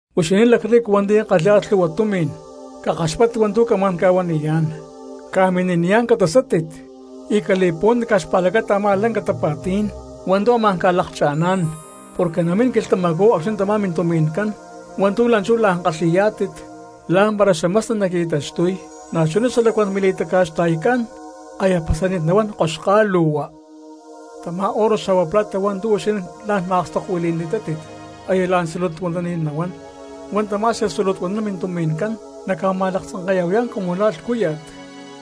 Huixinín lacrrico hua̠nti̠ kalhi̠yá̠tit lhu̠hua tumi̠n, ¡cakaxpáttit hua̠ntu̠ camá̠n ca̠huaniyá̠n! ¡Ca̠mini̠niyá̠n catasátit y cali̠puhuántit caj xpa̠lacata a̠má lanca tapa̠tí̠n hua̠ntu̠ amá̠n ca̠lakcha̠ná̠n! Porque namín quilhtamacú acxni̠ tamá mintumi̠ncán hua̠ntu̠ la̠nchú la̠n kalhi̠yá̠tit lá̠mpara xamasni naqui̠taxtuy, na̠chuná xalacuán mili̠taca̠xta̠ycán aya pasani̠t nahuán koxkálu̠hua. Tamá oro xa̠hua plata hua̠ntu̠ huixinín la̠n ma̠akstokuili̠ni̠tátit aya la̠n tzulutuanani̠t nahuán, huá tamá xatzulutuanán mintumi̠ncán naca̠ma̠laktzanke̠ya̠huayá̠n cumu la̠ lhcúya̠t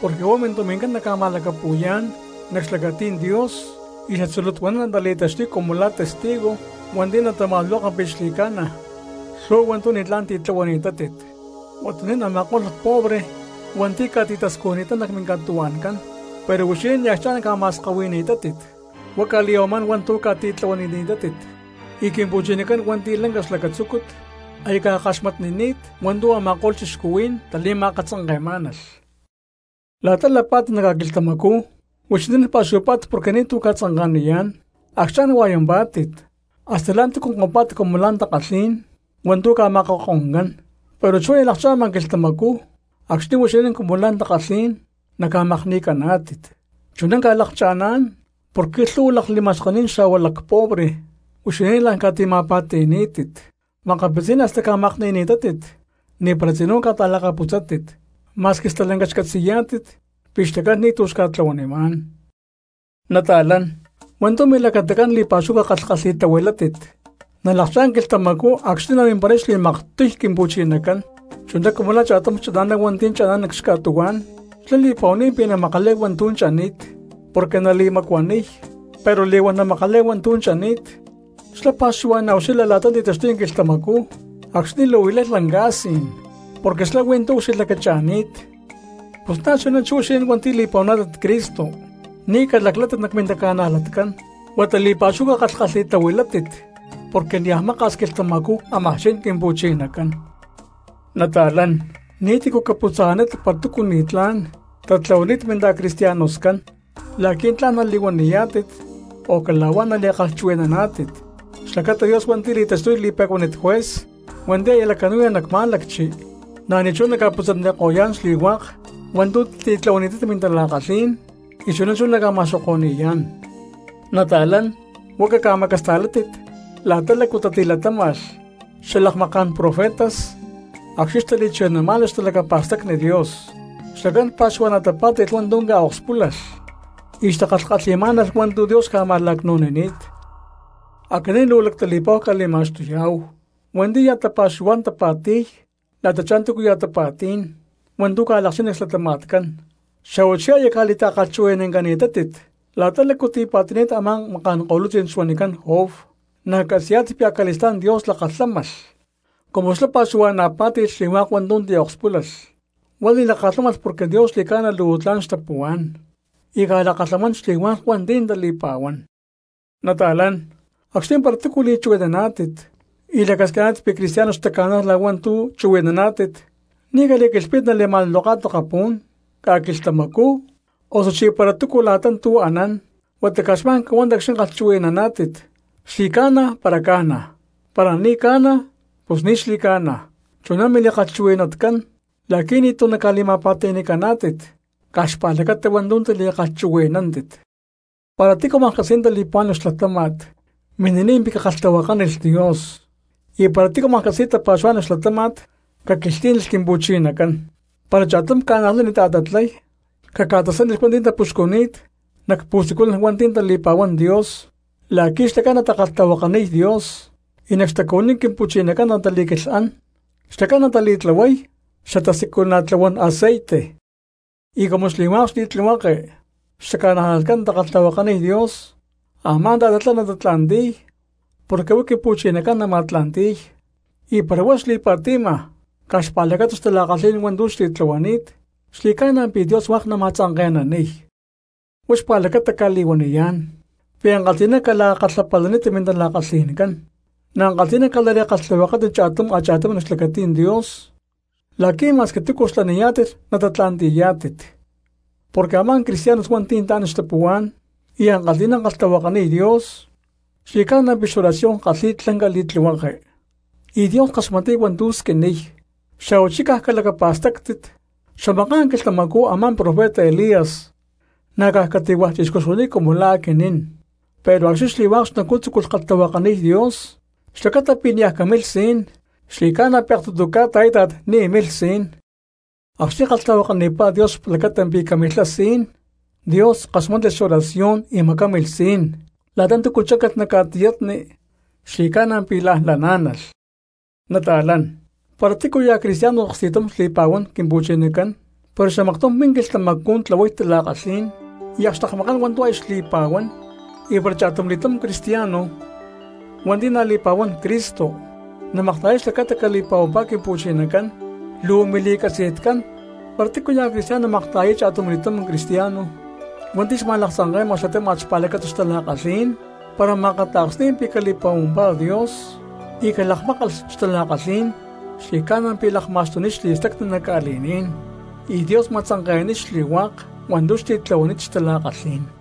porque huá mintumi̠ncán naca̠ma̠lacapu̠yá̠n nac xlacatí̠n Dios y xatzulutuanán natali̠taxtuy cumu la̠ testigo hua̠nti̠ natama̠luloka pi̠ xli̠ca̠na lhu̠hua hua̠ntu̠ ni̠tlá̠n tili̠tlahuani̠tátit. Huatuní̠n a̠ma̠ko̠lh lacpobre cristianos hua̠nti̠ ca̠tita̠scujni̠tán nac minca̠tuhua̠ncán pero huixinín ni̠ acchá̠n ca̠tima̠skahui̠ni̠tátit, huá ca̠li̠ya̠huamá̠n hua̠ntu̠ ca̠titlahuanini̠tátit, y Quimpu̠chinacán hua̠nti̠ lanca xlacatzúcut aya ca̠kaxmatnini̠t hua̠ntu̠ a̠ma̠ko̠lh cristianos tali̠ma̠akatzanke̠má̠nalh. La̠ta lapá̠tit nac ca̠quilhtamacú huixinín pa̠xuhuapá̠tit porque ni̠ti̠ ca̠tzanka̠niyá̠n, acchá̠n hua̠yampá̠tit, hasta la̠ntúcu kompá̠tit cumu la̠ takalhí̠n hua̠ntu̠ ca̠makakoncán, ¡pero chú aya lakcha̠ma quilhtamacú acxni̠ huixinín cumu la̠ takalhí̠n naca̠makni̠caná̠tit! Chuná ca̠lakcha̠ná̠n porque lhu̠hua lakli̠ma̠xkení̠n xa̠hua lacpobre cristianos huixinín la̠n ca̠tima̠pa̠ti̠ni̠ni̠tátit, makapitzí̠n hasta ca̠makni̠ni̠tátit ni̠para tzinú ca̠ta̠lakaputzátit ma̠squi stalanca xcatzi̠yá̠tit pi̠ xlacán ni̠ti̠ xca̠tlahuanimá̠n. Nata̠lán, hua̠ntu̠ milacatacán li̠pa̠xúhu cakalhkalhi̠tahuilátit nalakchá̠n quilhtamacú acxni̠ namimparay xli̠maktiy Quimpu̠chinacán, chuná cumu la̠ cha̠tum chana̠ná hua̠nti̠ chana̠nán nac xca̠tuhuá̠n xlá li̠pa̠huani̠t pi̠ namakalay hua̠ntu̠ chani̠t porque nali̠macuaniy, pero li̠huán namakalay hua̠ntu̠ chani̠t xlá pa̠xuhua̠na̠ ucxilha la̠ta ti̠taxtuy quilhtamacú acxni̠ luu lay lanca sí̠n porque xlá huí tu̠ ucxilhlacacha̠ni̠t. Pus na̠chuná chú huixinín hua̠nti̠ li̠pa̠huaná̠tit Cristo ni̠ calaclátit nac mintaca̠najlatcán, huata li̠pa̠xúhu cakalhkalhi̠tahuilátit porque niaj maka̠s quilhtamacú ámaj chin Quimpu̠chinacán. Nata̠lán, ni̠tícu caputza̠nanítit para túcu ni̠tlá̠n tatlahuani̠t minta̠cristianoscán la̠qui̠ tla̠n nali̠huaniyá̠tit o cala̠huá nali̠kalhchuhui̠naná̠tit, xlacata Dios hua̠nti̠ li̠taxtuy li̠pe̠cuánit juez hua̠nti̠ aya lacanu̠ya nac má̠lacchi na̠ ni̠chuná naca̠putza̠naniko̠yá̠n xli̠hua̠k hua̠ntu̠ titlahuani̠tátit mintala̠kalhí̠n y chuná chú naca̠ma̠xoko̠ni̠yá̠n. Nata̠lán, huá caca̠macasta̠látit la̠ta lácu tatilatáma̠lh xalakmaká̠n profetas acxni̠ xtali̠chuhui̠namá̠nalh xtalacapa̠stacni Dios, xlacán pa̠xuhua̠na̠ tapá̠ti̠lh hua̠ntu̠ ca̠akspúlalh y xtakalhkalhi̠má̠nalh hua̠ntu̠ Dios xca̠ma̠lacnu̠nini̠t. Aquinín luu lactali̠pa̠hu cca̠li̠ma̠xtuyá̠hu hua̠nti̠ ya̠ tapa̠xuhuá̠n tapa̠ti̠y la̠tachá túcuya̠ tapa̠tí̠n hua̠ntu̠ ca̠lakchín nac xlatama̠tcán, xa̠huachí aya ca̠li̠ta̠kalhchuhui̠nancani̠tátit la̠ta lácu tipa̠ti̠ni̠t a̠má maká̠n ko̠lutzí̠n xuanicán Job, na̠ catzi̠ya̠tittá pi̠ acali̠stá̠n Dios lakalhámalh cumu xlá pa̠xuhua̠na̠ pá̠ti̠lh xli̠hua̠k hua̠ntu̠ akspúlalh; huá li̠lakalhámalh porque Dios xli̠ca̠na luu tla̠n xtapuhuá̠n y ca̠lakalhamán xli̠hua̠k hua̠nti̠ tali̠pa̠huán. Nata̠lán, acxni̠ para túcu li̠chuhui̠naná̠tit y lacasquiná̠tit pi̠ cristianos xtaca̠nájlalh hua̠ntu̠ chuhui̠nántit, ni̠ cali̠quilhpítit nali̠ma̠luloká̠tit akapú̠n, ca̠quilhtamacú, osuchí para túcu la̠ta tu̠ anán, huata caj xma̠n cahuántit acxni̠ kalhchuhui̠naná̠tit “Xli̠ca̠na”, para ca̠na, para ni̠ ca̠na pus “Ni̠ xli̠ca̠na”, chuná mili̠kalhchuhui̠natcán la̠qui̠ ni̠ti̠ naca̠li̠ma̠pa̠ti̠ni̠caná̠tit caj xpa̠lacata hua̠ntu̠ tili̠kalhchuhui̠nani̠tátit. Para tícu maklhcatzi̠y tali̠puhuá̠n nac xlatáma̠t, mini̠niy pi̠ cakalhtahuakánilh Dios; y para tícu maklhcatzi̠y tapa̠xuhuá̠n nac xlatáma̠t, caquilhtlí̠nilh Quimpu̠chinacán. Para cha̠tum cristiano ta̠tatlay, caca̠tasánilh hua̠nti̠ tapuxcuni̠t nac pu̠siculan hua̠nti̠ tali̠pa̠huán Dios la̠qui̠ xlacán natakalhtahuakaniy Dios y nac xtacuhuiní Quimpu̠chinacán natali̠quilhán, xlacán natali̠tlahuay xatasiculana̠tlahuán aceite. Y cumu xli̠hua̠k xli̠tlihueke xtaca̠najlatcán natakalhtahuakaniy Dios a̠má ta̠tatlá natatla̠nti̠y porque huá Quimpu̠chinacán nama̠tla̠nti̠y; y para huá xli̠pa̠ti̠ma caj xpa̠lacata xtala̠kalhí̠n hua̠ntu̠ xtitlahuani̠t, xli̠ca̠na pi̠ Dios hua̠k nama̠tzanke̠naniy. Huá xpa̠lacata cca̠li̠huaniyá̠n pi̠ ankalhi̠ná cala̠kalhapalanítit mintala̠kalhi̠ncán, na̠ ankalhi̠na cala̠li̠kalhtahuakátit cha̠tum a̠cha̠tum nac xlacatí̠n Dios la̠qui̠ ma̠squi túcu xlaniyá̠tit natatla̠nti̠yá̠tit porque a̠má cristianos hua̠nti̠ tla̠n xtapuhuá̠n y ankalhi̠ná kalhtahuakaniy Dios xli̠ca̠na pi̠ xoración kalhi̠y lanca li̠tlihueke y Dios kaxmatniy hua̠ntu̠ squiniy. Xa̠huachí caj calacapa̠stáctit xamaká̠n quilhtamacú a̠má profeta Elías na̠ caj cati̠hua̠ chixcú xuani̠t cumu la̠ aquinín, pero acxni̠ xli̠hua̠k xnacú tzúculh kalhtahuakaniy Dios xlacata pi̠ niaj camilh sií̠n xli̠ca̠na pi̠ aktutu ca̠ta a̠íta̠t ni̠ milh sií̠n. Acxni̠ kalhtahuakanipá Dios xlacata pi̠ camacamilhá sí̠n Dios kaxmátnilh xoración y macámilh sí̠n, la̠ta túcu cháncalh nac ca̠tiyatni xli̠ca̠na pi̠ la̠n laná̠nalh. Nata̠lán, para tícuya̠ cristiano aksti̠tumá xli̠pa̠huán Quimpu̠chinacán pero xamaktum min quilhtamacú tlahuay tala̠kalhí̠n y akxtekmakán hua̠ntu̠ aya xli̠pa̠huán, y para cha̠tumli̠túm cristiano hua̠nti̠ na̠ li̠pa̠huán Cristo namakta̠yay xlacata cali̠pa̠huampá Quimpu̠chinacán, luu mili̠catzi̠tcán para tícuya̠ cristiano makta̠yay cha̠tumli̠túm cristiano hua̠nti̠ xma̠laktzanke̠ma xlatáma̠t xpa̠lacata xtala̠kalhí̠n, para ma̠akata̠ksni̠y pi̠ cali̠pa̠huampá Dios y calakmákalh xtala̠kalhí̠n xli̠ca̠na pi̠ lakma̠xtuniy xli̠stacni nac ca̠li̠ní̠n y Dios ma̠tzanke̠naniy xli̠hua̠k hua̠ntu̠ xtitlahuani̠t xtala̠kalhí̠n.